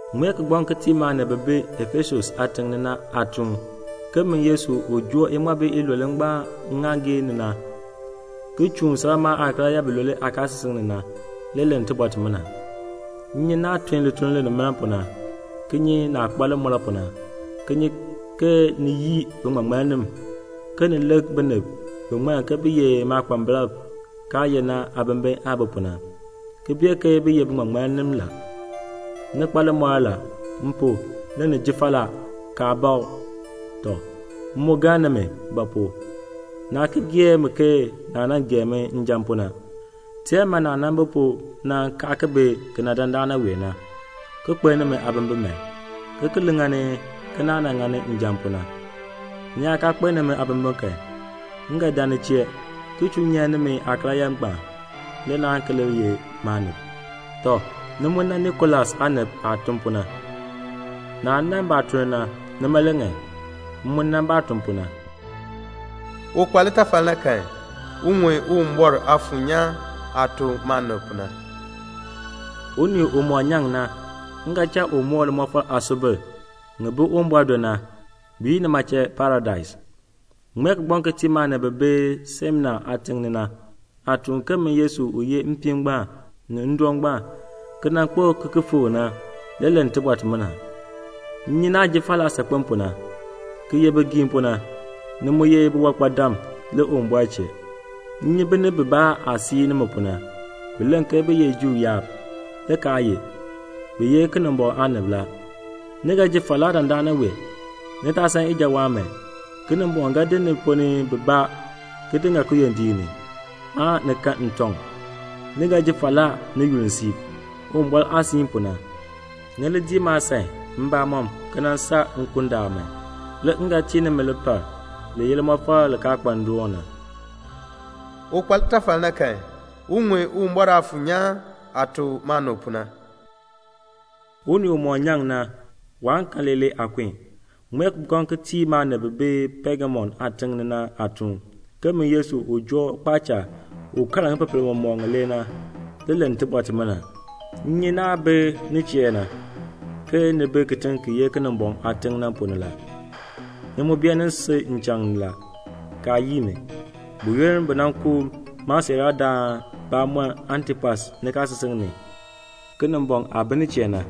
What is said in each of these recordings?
"Ŋmee kigbaŋ ki tii maanib bi bi Efesus aatiŋ ni na aatuun ke min Yesu u joo iŋmabi ilule ngbaan ŋŋaaŋgii ni na, ki chuun salmaa aakaryaa bilule aakaasisik ni na, le len tibɔr timina: M nyi naah tun lituln linimaln pu na, ki nyi naah kpa limɔr pu na, ki nyi ke ni yii biŋmaŋmannim, ke ni lik binib bi ŋmann ke bi ye maakpambalb kaa ye na aabimbin aah bi pu na, ki bee ke bi ye biŋmaŋmannim la. Ni kpa limɔr la. M pu, le ni ji falaa, kaa bakl. Tɔ, m mu galn nimi; ba pu? naa ki gee mi ke naah nan gee mi njan pu na. Teer man naah nan bi pu na kaa ki bi kena dandana wee na, ki kpeln nimi aabimbin man, ki ki li ŋani ke naah nan ŋani njan pu na. Ni yaa kaa kpeln nimi aabimbin kan, m ga dan ni chee ki chuu nyan nimi aakaryaa ngbaan, le naan ki li ye maanib. Tɔ, ni mu nan Nikolas aanib aah tun pu na. Naah nan baatuln na, nima le ŋan; m mu nan baah tun pu na. "Un kpa litafal na kan, un ŋun Uwumbɔr Aafuur nyaan aah tuk maanib pu na. "Unii umɔk nyaŋ na, m ga cha u moo limɔfal aasubil ŋi bi Uwumbɔr do na, bi yi nima chee Paradais. "Ŋmee kigbaŋ ki tii maanib bi bi Smina aatiŋ ni na aatuun ke min Yesu u ye mpiin ngbaan ni ndoon ngbaan, ki nan kpo ki ki fikr na, le len tibɔr timina: M nyi naah ji falaa saakpen pu na, ki ye bigiim pu na; ni mu ye biwankpadam le Uwumbɔr chee. M nyi binib bibaa aah sii nimi pu na. Bi len ke bi ye Juu yaab, le kaa ye; bi ye Kinimbɔŋ aanib la. Ni ga ji falaa dandana wee; ni taa san ijawaan man. Kinimbɔŋ ga di ni ponn ni bibaa ki di ŋa kiyondiik ni, aan ni kan ntɔŋ. Ni ga ji falaa ni yunn siib, Uwumbɔr aah siin pu na. Ni li dii maasan mbamɔm ki nan saa nkundaal man. Le m ga tii nimi lipal li ye limɔfal li kaa kpa ndoon na. "Un kpa litafal na kan, un ŋun Uwumbɔr Aafuur nyaan aah tuk maanib pu na. "Unii umɔk nyaŋ na, waan kan leelee aakun. "Ŋmee kigbaŋ ki tii maanib bi bi Pegamum aatiŋ ni na aatuun ke min Yesu u joo kpaacha u kaar ŋipepel mɔmɔk ŋilee na, le len tibɔr timina: M nyi naah bi nin chee na, ke ni bi kitiŋ ki ye Kinimbɔŋ aatiŋ na ponn ni la. Ni mu beenin sil nchaŋ ni la, kaa yii mi. Buyoonn bi nan ku maasiiraadaan bamɔnn Antipas nikaasisik ni, Kinimbɔŋ aah bi nin chee na,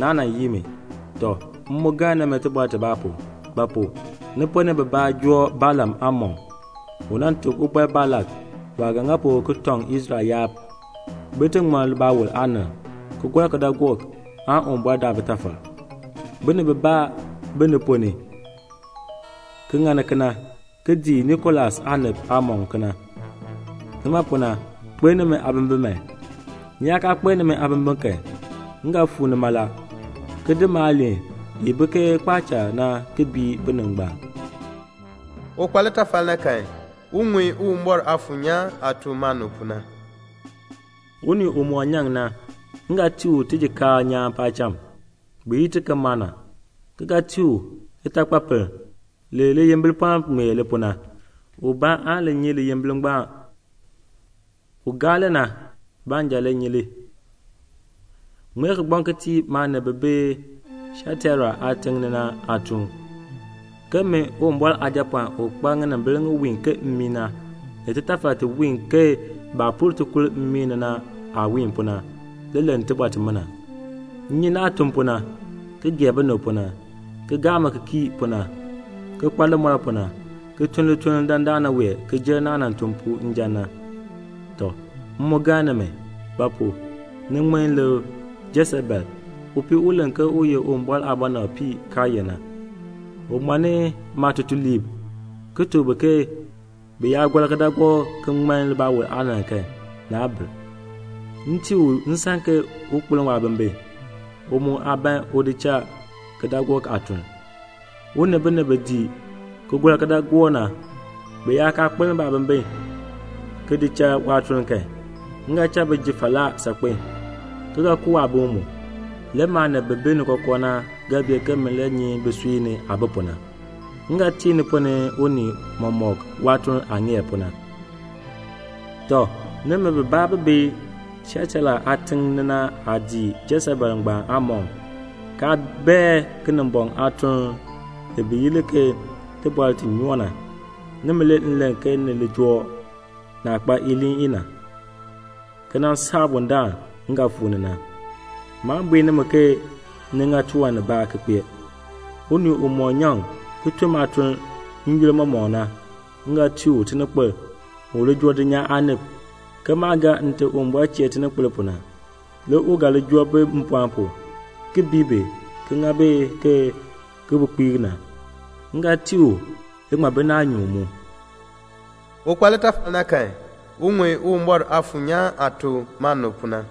naa nan yii mi. Tɔ, m mu galn nimi tibɔr tibaa pu. Ba pu? Ni ponn ni bibaa joo Balaam aamɔkm, u nan tuk Ubɔr Balak waah ga ŋa pu ki tɔŋ Israel yaab bin ti ŋman libaawol aanann, ki gɔr kidaagook, aan Uwumbɔr daa bitafal. Binib bibaa bi ni ponn ni mu, ki ŋani kena, ki dii Nikolas aanib aamɔkm kena. Nima pu na, kpeln nimi aabimbin man. Ni yaa kaa kpeln nimi aabimbin kan, m ga fuu ni mala, ki di maaliin i bi ke kpaacha na ki bii binib ngbaan. "Un kpa litafal na kan, un ŋun Uwumbɔr Aafuur nyaan aah tuk maanib pu na. "Unii umɔk nyaŋ na, m ga tii u tijikaar nyaan paacham, bi yi ti ke mana, ki ga tii u litakpapiln li liyimbipɔln ŋmee li pu na. Ubaa aan li nyi liyimbipɔln ngbaan; un gaa li na baanja le ga li nyi. "Ŋmee kigbaŋ ki tii maanib bi bi Tiataira aatiŋ ni na aatuun ke min Uwumbɔr Aajapɔɔn u kpa ŋinimbil ŋi wiin ke mmii na, ni titaafar ti wiin ke baah pur tikur mmii ni na aah wiin pu na, le len tibɔr timina: M nyi naah tun pu na, ki gee binib pu na, ki gaa mi ki kii pu na, ki kpa limɔr pu na, ki tun lituln dandana wee ki jer naah nan tun njan pu na. Tɔ, m mu galn nimi; ba pu? ni ŋmin lik Jesebel, upii u len ke u ye Uwumbɔr aabɔnabpii kaa ye na. U ŋmanni maatutuliib, ki tuk bi ke bi yaa gɔr kidaagook ki ŋman libaawol aanann kan, naa bir. M tii u nsan ke un kpeln waabimbin, u mu aa ban un di cha kidaagook aatuln. U ni binib bi dii ki gɔr kidaagook na, bi yaa kaa kpeln baabimbin ki di cha waatuln kan, m ga cha bi ji falaa saakpen, ki ga ku waabim mu. Le maanib bi bi ni kookoo na ga bee ke min le nyi bisui ni aah bi pu na. M ga tii ni ponn ni unii mɔmɔk waatuln aah ŋeer pu na. "Tɔ, nimi bibaa bi bi Tiataira aatiŋ ni na aa dii Jesebel ngbaan aamɔkm, kaa bae Kinimbɔŋ aatuln li bi yi li ke 'tibɔr ti nyoo na.' Nimi le m len ke ni li joo naah kpa iliin i na, ki nan saa bundaln m ga fuu ni na. Maan bui nimi ke ni ŋa tiwan nibaa ki kpee. Unii umɔk nyaŋ ki tun maatuln n-yoonn mɔmɔk na, m ga tii u tininkpil u li joo dulnyaa aanib, ke maah gaa Nte Uwumbɔr chee tininkpil pu na. Le u ga li joo bi mpɔɔn pu, ki bii bi ki ŋa bi ke kibukpeek na. M ga tii u naanyuun mu. "Un kpa litafal na kan, un ŋun Uwumbɔr Aafuur nyaan aah tuk maanib pu na.